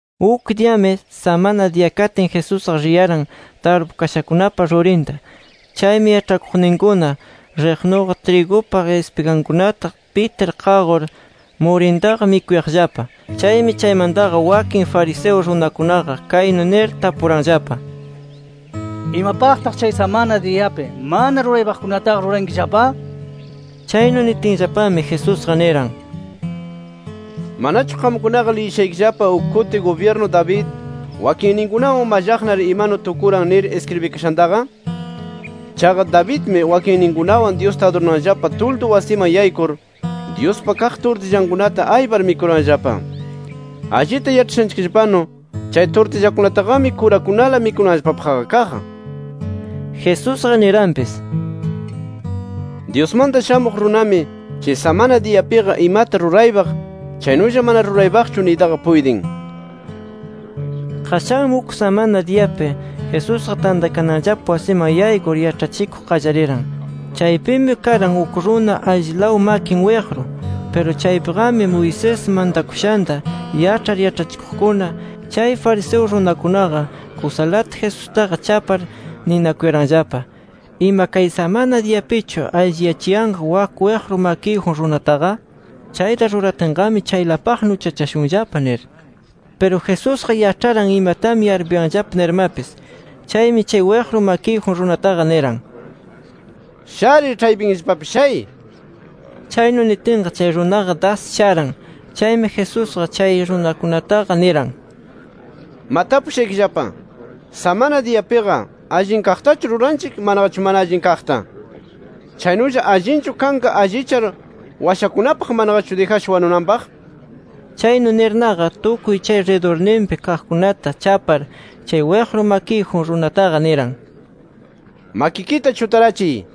Uk diyami samana diya katin, Jesusqa riyaran tarpukashakunapa rurinta. Chaymi, yaĉhakuqninkuna riqnuqa trigupa ispigankunata pitir qaqur murintaqa mikuyaqllapa. Chaymi chaymantaqa, wakin fariseo runakunaqa kaynu nir tapuranllapa: —¿Imapaqtaq chay samana diyapi mana ruraypaqkunataqa, rurankillapa? nir. Chaynu nitinllapami, Jesusqa niran: —¿Manachu qamkunaqa liyishaykillapa, uk kuti gubyirnu David wakinninkunawan mallaqnar imanu tukuran nir iskribikashantaqa? Chaqa Davidmi wakinninkunawan Dyusta adurananllapa tuldu wasiman yaykur, Dyuspa kaq turtillankunata aypar mikuranllapa. Allita yaĉhashanchikllapanu, chay turtillakunataqami, kurakunala mikunanllapapaqqa kaq. Jesusqami niranpis: —Dyusmanta Shamuq Runami, chay samana diyapiqa imata ruraypaq chaynulla mana ruraypaqchu niytaqa puytin. Qashanmi uk samana diyapi, Jesusqa tantakananllapa wasiman yaykur yaĉhachikuq qallariran. Chaypimi karan uk runa allilaw makin wiqru. Piru chaypiqami Moisés mantakushanta yaĉhar yaĉhachikuqkuna, chay fariseo runakunaqa kusalata Jesustaqa chapar ninakuyaranllapa: “¿Ima kay samana diyapichu alliyachiyanqa wak wiqru makiyjun runataqa? Chayta ruratinqami, chaylapaqna uchachashunllapa” nir. Piru Jesusqa yaĉharan imatami yarpuyanllapa nirmapis. Chaymi, chay wiqru makiyjun runataqa niran: —Sharir, ĉhaypinllapapi shay. Chaynu nitinqa chay runaqa das sharan. Chaymi Jesusqa chay runakunataqa niran: —Ma tapushaykillapa, samana diyapiqa, ¿allin kaqtachu ruranchik manaqachu mana allin kaqta? Chaynulla ¿allinchu kanqa allichar washakunapaq manaqachu dijasha wanunanpaq? Chaynu nirnaqa, tukuy chay ridurninpi kaqkunata chapar, chay wiqru makiyjun runataqa, niran: —Makikita chutarachiy.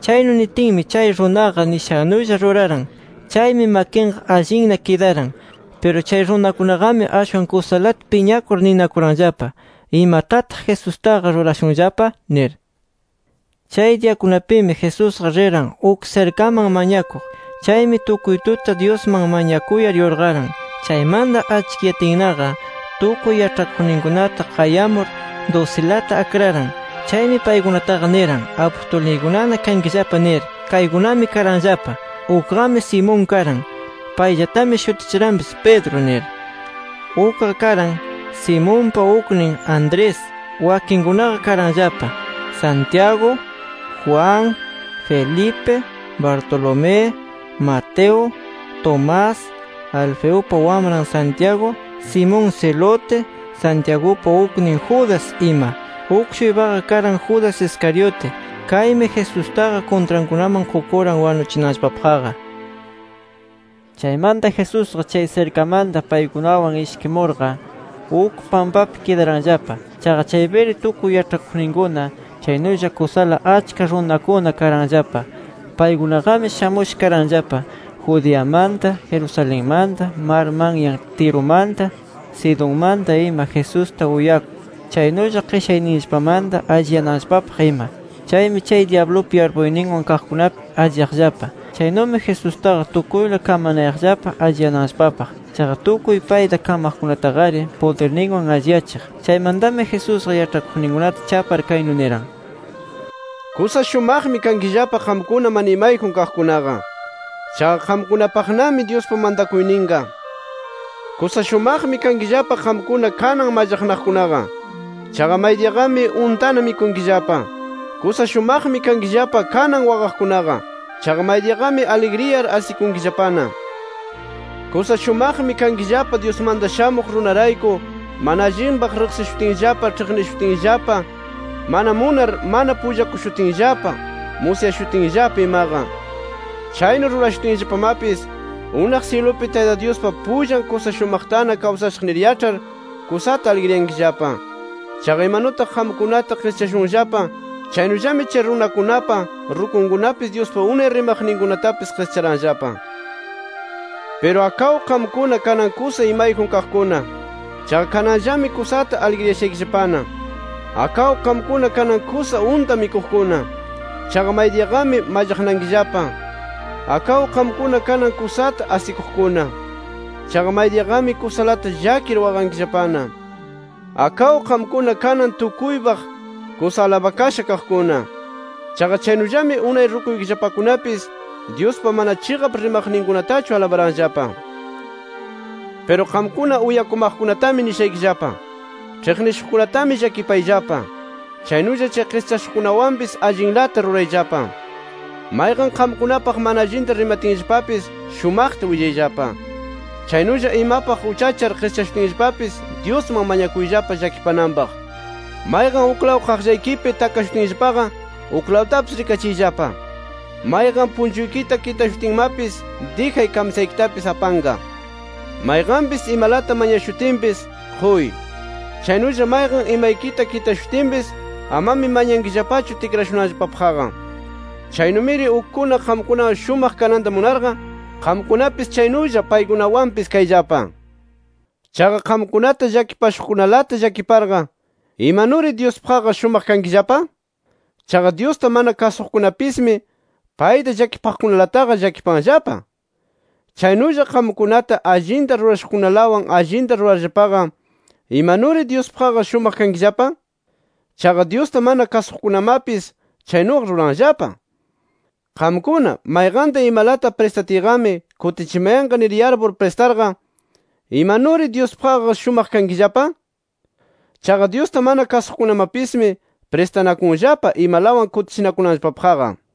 Chaynu nitinmi, chay runaqa nishannullata ruraran. Chaymi makinqa allinna kidaran. Piru chay runakunaqami ashwan kusalata piñakur ninakuranllapa: “¿Imatataq Jesustaqa rurashunllapa?” nir. Chay diyakunapimi, Jesusqa riran uk sirkaman mañakuq. Chaymi tukuy tuta Dyusman mañakuyar yurqaran. Chaymanta achkiyatinnaqa, tukuy yaĉhakuqninkunata qayamur dusilata akraran. Chaymi paykunataqa niran: “Apustulniykunana kankillapa” nir. Kaykunami karanllapa: Ukqami Simón karan. Payllatami shutichiranpis Pedro nir. Ukqa karan Simonpa uknin Andrés. Wakinkunaqa karanllapa: Santiago, Juan, Felipe, Bartolomé, Mateo, Tomás, Alfeupa wamran Santiago, Simón Zelote, Santiagupa uknin Judas ima. Uk-shuypaqa karan Judas Iscariote. Kaymi Jesustaqa kuntrankunaman qukuran wanuchinanllapapaqqa. Chaymanta Jesusqa chay sirkamanta paykunawan ishkimurqa, uk pampapi kidaranllapa. Chaqa chaypiri tukuy yaĉhakuqninkuna chaynulla kusala achka runakuna karanllapa. Paykunaqami shamusha karanllapa, Judeamanta, Jerusalenmanta, mar manyan Tirumanta, Sidonmanta ima Jesusta uyakuq, chaynulla qishayninllapamanta alliyananllapapaq ima. Chaymi chay dyablupa yarpuyninwan kaqkunapis alliyaqllapa. Chaynumi Jesustaqa tukuyla kamanayaqllapa alliyananllapapaq. Chaqa tukuy payta kamaqkunataqari pudirninwan alliyachiq. Chaymantami Jesusqa yaĉhakuqninkunata chapar kaynu niran: “Kusa shumaqmi kankillapa qamkuna mana imayjun kaqkunaqa. Chaqa qamkunapaqnami Dyuspa mantakuyninqa. Kusa shumaqmi kankillapa qamkuna kanan mallaqnaqkunaqa. Chaqa maydiyaqami untana mikunkillapa. Kusa shumaqmi kankillapa, kanan waqaqkunaqa. Chaqa maydiyaqami aligriyar asikunkillapana. Kusa shumaqmi kankillapa Dyusmanta Shamuq Runarayku mana allinpaq riqsishutinllapa, ĉhiqnishutinllapa, mana munar mana pullakushutinllapa, musyashutinllapa imaqa. “Chaynu rurashutinllapamapis, unaq syilupi Tayta Dyuspa pullan kusa shumaqtana kawsashaq nir yaĉhar, kusata aligriyankillapa. Chaqa imanutaq qamkunata qischashunllapa, chaynullami chay runakunapa rukunkunapis Dyuspa unay rimaqninkunatapis qischaranllapa. Piru akaw qamkuna kanan kusa imayjun kaqkuna. Chaqa kananllami kusata aligriyashaykillapana. Akaw qamkuna kanan kusa unta mikuqkuna. Chaqa maydiyaqami mallaqnankillapa. Akaw qamkuna kanan kusata asikuqkuna. Chaqa maydiyaqami kusalata llakir waqankillapana. Akaw qamkuna kanan tukuypaq kusa alabakasha kaqkuna. Chaqa chaynullami unay rukuykillapakunapis, Dyuspa mana chiqap rimaqninkunatachu alabaranllapa. “Piru qamkuna uyakumaqkunatami nishaykillapa: Ĉhiqnishuqkunatami llakipayllapa. Chaynulla chay qischashuqkunawanpis allinlata rurayllapa. Mayqan qamkunapaq mana allinta rimatinllapapis, shumaqta willayllapa. Chaynulla imapaq uchachar qischashutinllapapis Dyusman mañakuyllapa llakipananpaq. Mayqan uklaw qaqllaykipi takashutinllapaqa, uklawtapis rikachiyllapa. Mayqan punchuykita kitashutinmapis, dijay kamsaykitapis apanqa. Mayqanpis imalata mañakushutinpis, quy. Chaynulla mayqan imaykita kitashutinpis, amami mañankillapachu tikrashunanllapapaqqa. Chaynumiri ukkuna qamkunawan shumaq kananta munarqa, qamkunapis chaynulla paykunawanpis kayllapa. “Chaqa qamkunata llakipashuqkunalata llakiparqa ¿imanuri Dyuspaqqa shumaq kankillapa? Chaqa Dyusta mana kasuqkunapismi, payta llakipaqkunalataqa llakipanllapa. Chaynulla qamkunata allinta rurashuqkunalawan allinta rurarllapaqa, ¿imanuri Dyuspaqqa shumaq kankillapa? Chaqa Dyusta mana kasuqkunamapis chaynuqa ruranllapa. Qamkuna, mayqanta imalata pristatiyqami kutichimayanqa nir yarpur pristarqa, ¿imanuri Dyuspaqqa shumaq kankillapa? Chaqa Dyusta mana kasuqkunamapismi pristanakunllapa, imalawan kutichinakunanllapapaqqa.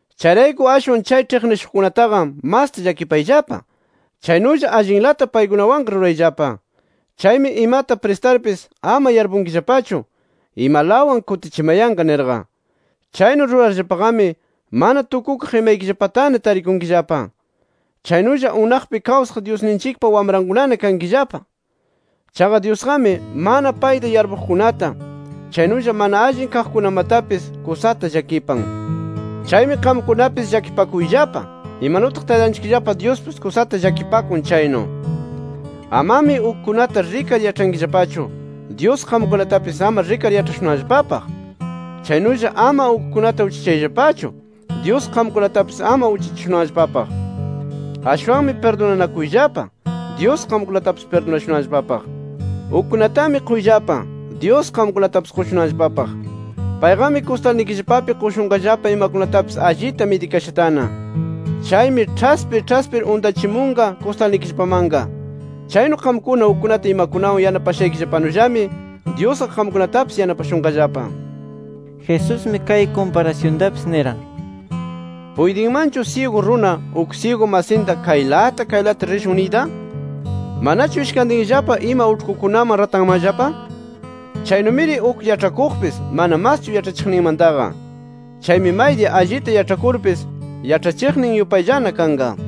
Chayrayku ashwan chay ĉhiqnishuqkunataqa masta llakipayllapa. Chaynulla allinlata paykunawanqa rurayllapa. Chaymi imata pristarpis, ama yarpunkillapachu: Imalawan kutichimayanqa nirqa. Chaynu rurarllapaqami mana tukukaq imaykillapatana tarikunkillapa. Chaynulla unaqpi kawsaq Dyusninchikpa wamrankunana kankillapa. Chaqa Dyusqami, mana payta yarpuqkunata, chaynulla mana allin kaqkunamatapis kusata llakipan. Chaymi qamkunapis llakipakuyllapa, imanutaq Taytanchikllapa Dyuspis kusata llakipakun chaynu. “Amami ukkunata rikar yaĉhankillapachu, Dyus qamkunatapis ama rikar yaĉhashunanllapapaq. Chaynulla ama ukkunata uchachayllapachu, Dyus qamkunatapis ama uchachashunanllapapaq. Ashwanmi pirdunanakuyllapa, Dyus qamkunatapis pirdunashunanllapapaq. Ukkunatami quyllapa, Dyus qamkunatapis qushunanllapapaq. Payqami kustalnikillapapi qushunqallapa imakunatapis allita midikashatana. Chaymi ĉhaspir ĉhaspir untachimunqa kustalnikillapamanqa. Chaynu qamkuna ukkunata imakunawan yanapashaykillapanullami, Dyusqa qamkunatapis yanapashunqallapa”. Jesusmi kay kumparasyuntapis niran: “¿Puytinmanchu syigu runa, uk syigu masinta kaylata kaylata rishun niyta? ¿Manachu ishkantinllapa ima uĉhkukunaman ratanmanllapa? Chaynumiri uk yaĉhakuqpis mana maschu yaĉhachiqninmantaqa. Chaymi maydiya allita yaĉhakurpis, yaĉhachiqnin yupayllana kanqa.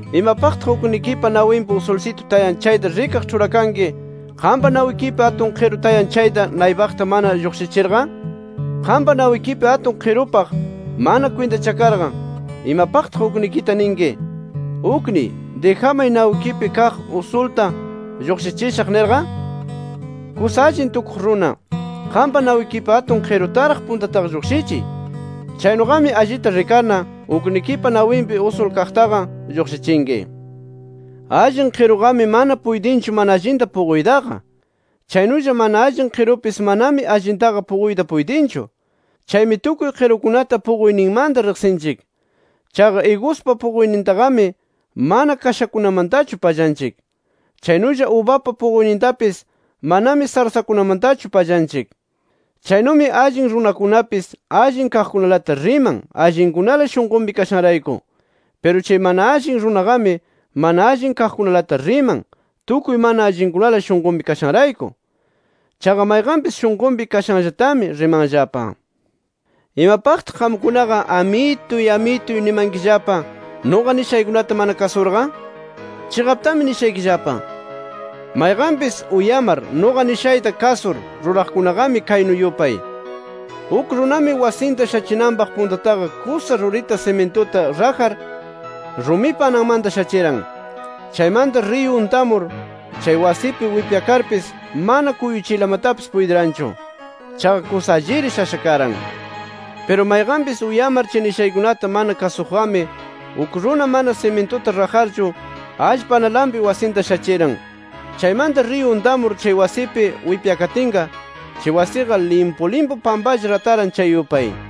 “¿Imapaqtaq uknikipa nawinpi usulsitu tayan chayta rikaq ĉhurakanki, qampa nawikipi atun qiru tayan chayta naypaqta mana lluqshichirqa? Qampa nawikipi atun qirupaq mana kwintachakarqa, ¿imapaqtaq uknikita ninki: ‘Ukniy, dijamay nawikipi kaq usulta lluqshichishaq’ nirqa? Kusa allin tukuq runa, qampa nawikipi atun qirutaraq puntataqa lluqshichiy. Chaynuqami allita rikarna, uknikipa nawinpi usul kaqtaqa lluqshichinki. “Allin qiruqami mana puytinchu mana allinta puquytaqa. Chaynulla mana allin qirupis manami allintaqa puquyta puytinchu. Chaymi tukuy qirukunata puquyninmanta riqsinchik. Chaqa iguspa puquynintaqami mana kashakunamantachu pallanchik. Chaynulla ubapa puquynintapis manami sarsakunamantachu pallanchik. Chaynumi allin runakunapis allin kaqkunalata riman allinkunala shunqunpi kashanrayku. Piru chay mana allin runaqami mana allin kaqkunalata riman, tukuy mana allinkunala shunqunpi kashanrayku. Chaqa mayqanpis shunqunpi kashanllatami, rimanllapa. “¿Imapaqtaq qamkunaqa ‘Amituy Amituy’ nimankillapa, nuqa nishaykunata mana kasurqa? Chiqaptami nishaykillapa: Mayqanpis uyamar nuqa nishayta kasur ruraqkunaqami kaynu yupay. Uk runami wasinta shachinanpaq puntataqa kusa rurita simintuta rajar, rumipa ananmanta shachiran. Chaymanta riyu untamur, chay wasipi wipyakarpis mana kuychiylamatapis puytiranchu. Chaqa kusa alliri shasha karan. Piru mayqanpis uyamar chay nishaykunata mana kasuqqami, uk runa mana simintuta rajarchu allpa analanpi wasinta shachiran. Chaymanta riyu untamur chay wasipi wipyakatinqa, chay wasiqa limpu limpu pampalla rataran chay yupay”.